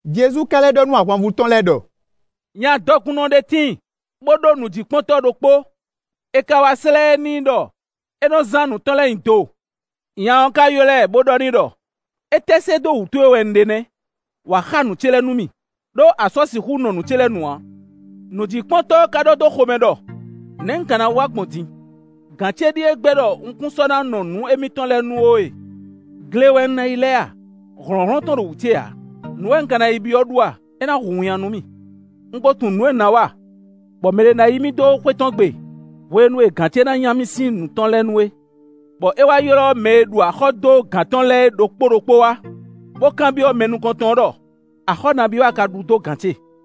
Jezu ka lɛ́ ɖɔ nú ahwanvú tɔn lɛ́ɛ ɖɔ: “Nya dɔkunnɔ ɖé tíin, bó ɖó nǔjíkpɔ́ntɔ́ ɖokpó; è ka wá slɛ́ ɛ n'i ɖɔ é nɔ zán nǔ tɔn lɛ́ɛ nyi do. Nya ɔ́ ka ylɔ́ ɛ, bó ɖɔ n'i ɖɔ: ‘Étɛ́ se dó wú towe wɛ un ɖe nɛ́? Wǎ xa nǔ ce lɛ́ɛ nú mì, ɖó a sɔ́ sixú nɔ nǔ ce lɛ́ɛ nu ǎ.’ Nǔjíkpɔ́ntɔ́ ɔ́ ka ɖɔ dó xomɛ ɖɔ: ‘Nɛ̌ un ka na wa gbɔn din? Gǎn ce ɖíe gbɛ́ ɖɔ un kún sɔ́ na nɔ nǔ émítɔn lɛ́ɛ nu ó e. Gle wɛ un ná yi lɛ a? Hlɔ̌nhlɔ́n tɔn ɖo wú ce ǎ. Nǔ wɛ un ka na yi byɔ́ ɖu a? É na hu winnyá nú mì. Un ko tunwun nǔ e un ná wa, bɔ mɛɖé ná yí mì dó xwé tɔn gbe, hwenu e gǎn ce na nya mì sín nǔ tɔn lɛ́ɛ nu é.’ Bɔ é wá ylɔ́ mɛ e ɖu axɔ́ dó gǎn tɔn lɛ́ɛ é ɖokpó ɖokpó wá, bó kanbyɔ́ mɛ nukɔn tɔn ɔ́ ɖɔ: ‘Axɔ́ nabí a ka ɖu dó gǎn ce?’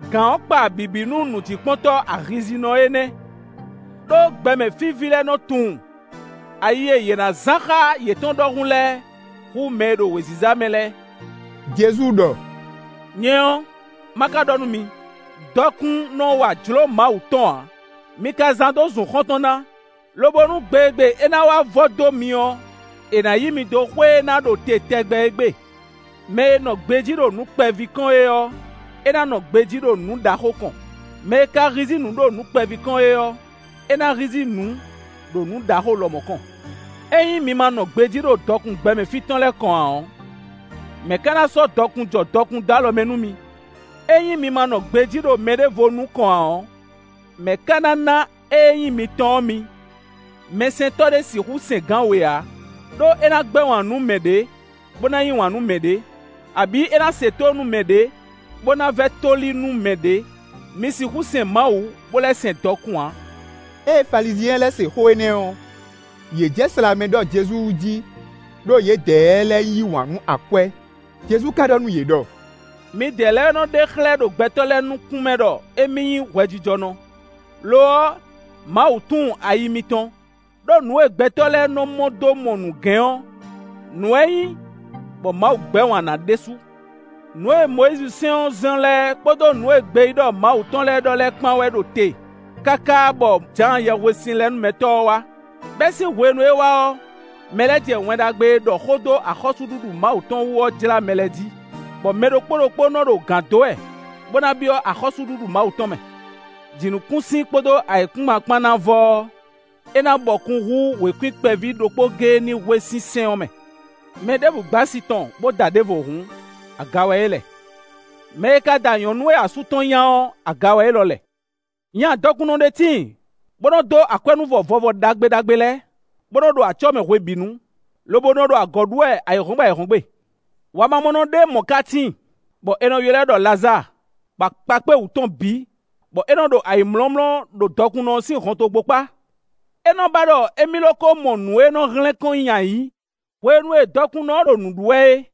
Gǎn ɔ́ kpa bǐbí nú nǔjíkpɔ́ntɔ́ ayihízíhízínɔ énɛ́; ɖó gbɛmɛ fí ví lɛ́ɛ nɔ tunwun ayi e yě ná zán xá yětɔn ɖɔhun lɛ́ɛ hú mɛ e ɖo wěziza mɛ lɛ́ɛ.” Jezu ɖɔ: “Nyɛ ɔ́, má ka ɖɔ nú mi: dɔkun nɔ wa jlǒ Mawu tɔn ǎ; mi ka zán dó zun xɔ́ntɔn ná, lobo nú gbe e gbe é ná wá vɔ dó mi ɔ́, è nǎ yí mi dó xwé e ná ɖo te tɛgbɛ é gbe. Mɛ e nɔ gbejí ɖo nǔ kpɛví kɔn é ɔ́, é ná nɔ gbejí ɖo nǔ ɖaxó kɔn; mɛ e ka hízí nǔ ɖo nǔ kpɛví kɔn é ɔ́, é ná hízí nǔ, ɖo nǔ ɖaxó lɔmɔ̌ kɔn. Ényí mi ma nɔ gbejí ɖo dɔkun gbɛmɛ fí tɔn lɛ́ɛ kɔn ǎ ɔ́, mɛ̌ ka ná sɔ́ dɔkun jɔ dɔkun dó alɔ mɛ nú mi? Ényí mi ma nɔ gbejí ɖo mɛɖěvo nú kɔn ǎ ɔ́, mɛ̌ ka ná ná ée nyí mitɔn ɔ́ mi? “Mɛsɛntɔ́ ɖé sixú sɛn gǎn we ǎ: ɖó é ná gbɛ́ wǎn nú mɛ ɖě, bó na yí wǎn nú mɛ ɖě; abǐ é ná se tónú nú mɛ ɖě, bó ná vɛ́ tóli nú mɛ ɖě. Mi sixú sɛn Mawu, bó lɛ́ sɛn dɔkun ǎ.” Ée Falizyɛn lɛ́ɛ se xó énɛ́ ɔ́, yě jɛ slǎmɛ ɖɔ Jezu wú jí, ɖó yědɛɛ lɛ́ɛ yí wǎn nú akwɛ́. Jezu ka ɖɔ nú yě ɖɔ: “Midɛɛ lɛ́ɛ wɛ nɔ ɖe xlɛ́ ɖo gbɛtɔ́ lɛ́ɛ nukún mɛ ɖɔ émí nyí hwɛjijɔnɔ; lo ɔ́, Mawu tunwun ayi mitɔn. Đó nǔ e gbɛtɔ́ lɛ́ɛ nɔ mɔ dó mɔ nǔgɛ́n ɔ́, nǔ wɛ é nyí bɔ Mawu gbɛ́ wǎn na ɖésú.” Nǔ e Mɔyízi sɛ́n ɔ́ zɔ́n lɛ́ɛ kpódó nǔ e gbeyíɖɔ Mawu tɔn lɛ́ɛ ɖɔ lɛ́ɛ kpán wɛ ɖo te káká bɔ Jǎan Yɛhwesinlɛnúmɛtɔ́ ɔ́ wá; bɛ́ sín hwenu e é wá ɔ́, mɛ lɛ́ɛ jɛ Wɛn Ɖagbe e ɖɔ xó dó axɔ́súɖuɖu Mawu tɔn wú ɔ́ jlá mɛ lɛ́ɛ jí; bɔ mɛ ɖokpó ɖokpó nɔ ɖo gǎn dó wɛ, bó na byɔ́ axɔ́súɖuɖu Mawu tɔn mɛ. Jǐnukúnsin kpódó ayǐkúngban kpán ná vɔ ɔ́, é ná bɔkun hú wěkwín kpɛví ɖokpó géé ní hwe sín sɛ́n ɔ́ mɛ. Mɛ ɖěbǔ gbɛ́ asi tɔn, bó da ɖěvo hǔn, aga wɛ é lɛ; mɛ e ka da nyɔ̌nu e asú tɔn nya ɔ́, aga wɛ élɔ́ lɛ. Nya dɔkunnɔ ɖé tíin, bó nɔ dó akwɛ́núvɔ vɔvɔ ɖagbe ɖagbe lɛ́ɛ, bó nɔ ɖo acɔ́ mɛ hwebǐnu, lobo nɔ ɖo agɔ̌ ɖu wɛ ayǐhɔ́ngbe ayǐhɔ́ngbe. Wamamɔnɔ ɖé mɔ̌ ka tíin, bɔ è nɔ ylɔ́ ɛ ɖɔ Lazáa, bɔ akpa kpé wǔtu tɔn bǐ, bɔ é nɔ ɖo ayǐmlɔ́mlɔ́ ɖo dɔkunnɔ ɔ́ sín hɔntogbó kpá. É nɔ ba ɖɔ émí lo ko mɔ nǔ e nɔ hlɛ́n kɔn nyi ayǐ hwenu e dɔkunnɔ ɔ́ ɖo nǔ ɖu wɛ é;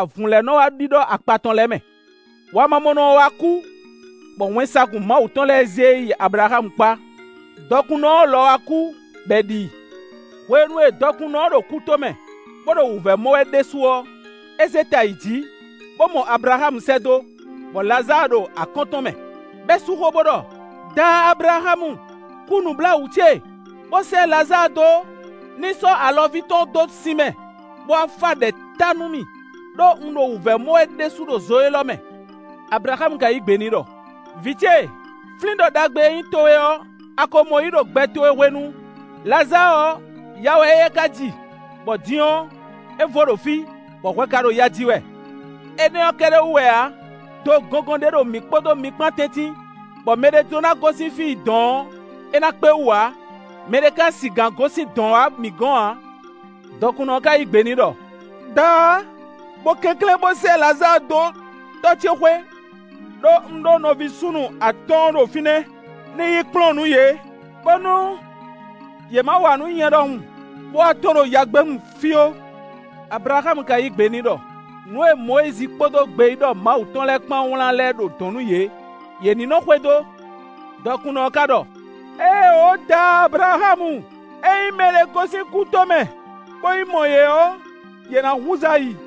avǔn lɛ́ɛ nɔ wá ɖíɖɔ́ akpa tɔn lɛ́ɛ mɛ. Wamamɔnɔ ɔ́ wá kú, bɔ wɛnsagun Mawu tɔn lɛ́ɛ zé e yi Ablaxámu kpá; dɔkunnɔ ɔ́ lɔ wá kú, bɔ è ɖi i. Hwenu e dɔkunnɔ ɔ́ ɖo kútomɛ, bó ɖo wǔvɛ́ mɔ wɛ ɖésú ɔ́, é zé ta yi jǐ, bó mɔ Ablaxámu sɛ́ dó, bɔ Lazáa ɖo akɔ́n tɔn mɛ; bɔ é sú xó, bó ɖɔ: “Daá Ablaxámu, kú nǔbláwǔ ce, bó sɛ́ Lazáa dó, ní sɔ́ alɔvínu tɔn dó sin mɛ, bó wá fá ɖɛ̌ ta nú mì, ɖó un ɖo wǔvɛ́ mɔ wɛ ɖésú ɖo zo élɔ́ mɛ.” Ablaxámu ka yí gbe n'i ɖɔ: “Vǐ ce, flín ɖɔ ɖagbe e nyí towe ɔ́, a ko mɔ yí ɖo gbɛ towe hwenu. Lazáa ɔ́, ya wɛ éyɛ́ ka ji, bɔ din ɔ́, é vo ɖo fí, bɔ hwɛ ka ɖo ya ji wɛ. Énɛ́ ɔ́ kɛ́ɖɛ́ wú wɛ ǎ; do gɔngɔn ɖé ɖo mǐ kpódó mi kpán tɛ́ntin, bɔ mɛɖé jló ná gosín fí yi dɔ̌n ɔ́, é ná kpé wú ǎ; mɛɖé ka sigǎn gosín dɔ̌n wá mǐ gɔ̌n ǎ.” Dɔkunnɔ ɔ́ ka yí gbe ɖɔ: “Daá, bo kɛnklɛ́n bó sɛ́ Lazáa dó tɔ́ ce xwé. Đó un ɖó nɔví súnnu atɔ́ɔ́n ɖo fínɛ́; ní yi kplɔ́n nǔ yě, bónú yě ma wa nǔ nyɛ ɖɔhun, bó wá tɔ́n ɖo yagbénu fí ó.” Ablaxámu ka yí gbe n'i ɖɔ: “Nǔ e Mɔyízi kpódó gbeyíɖɔ Mawu tɔn lɛ́ɛ kpán wlán lɛ́ɛ ɖo dɔ̌n nú yě; yě ní nɔ xwedó.” Dɔkunnɔ ɔ́ ka ɖɔ: “Éeǒ daá Ablaxámu. Ényí mɛɖé gosín kútomɛ, bó yi mɔ yě ɔ́, yě ná húzú ayi.”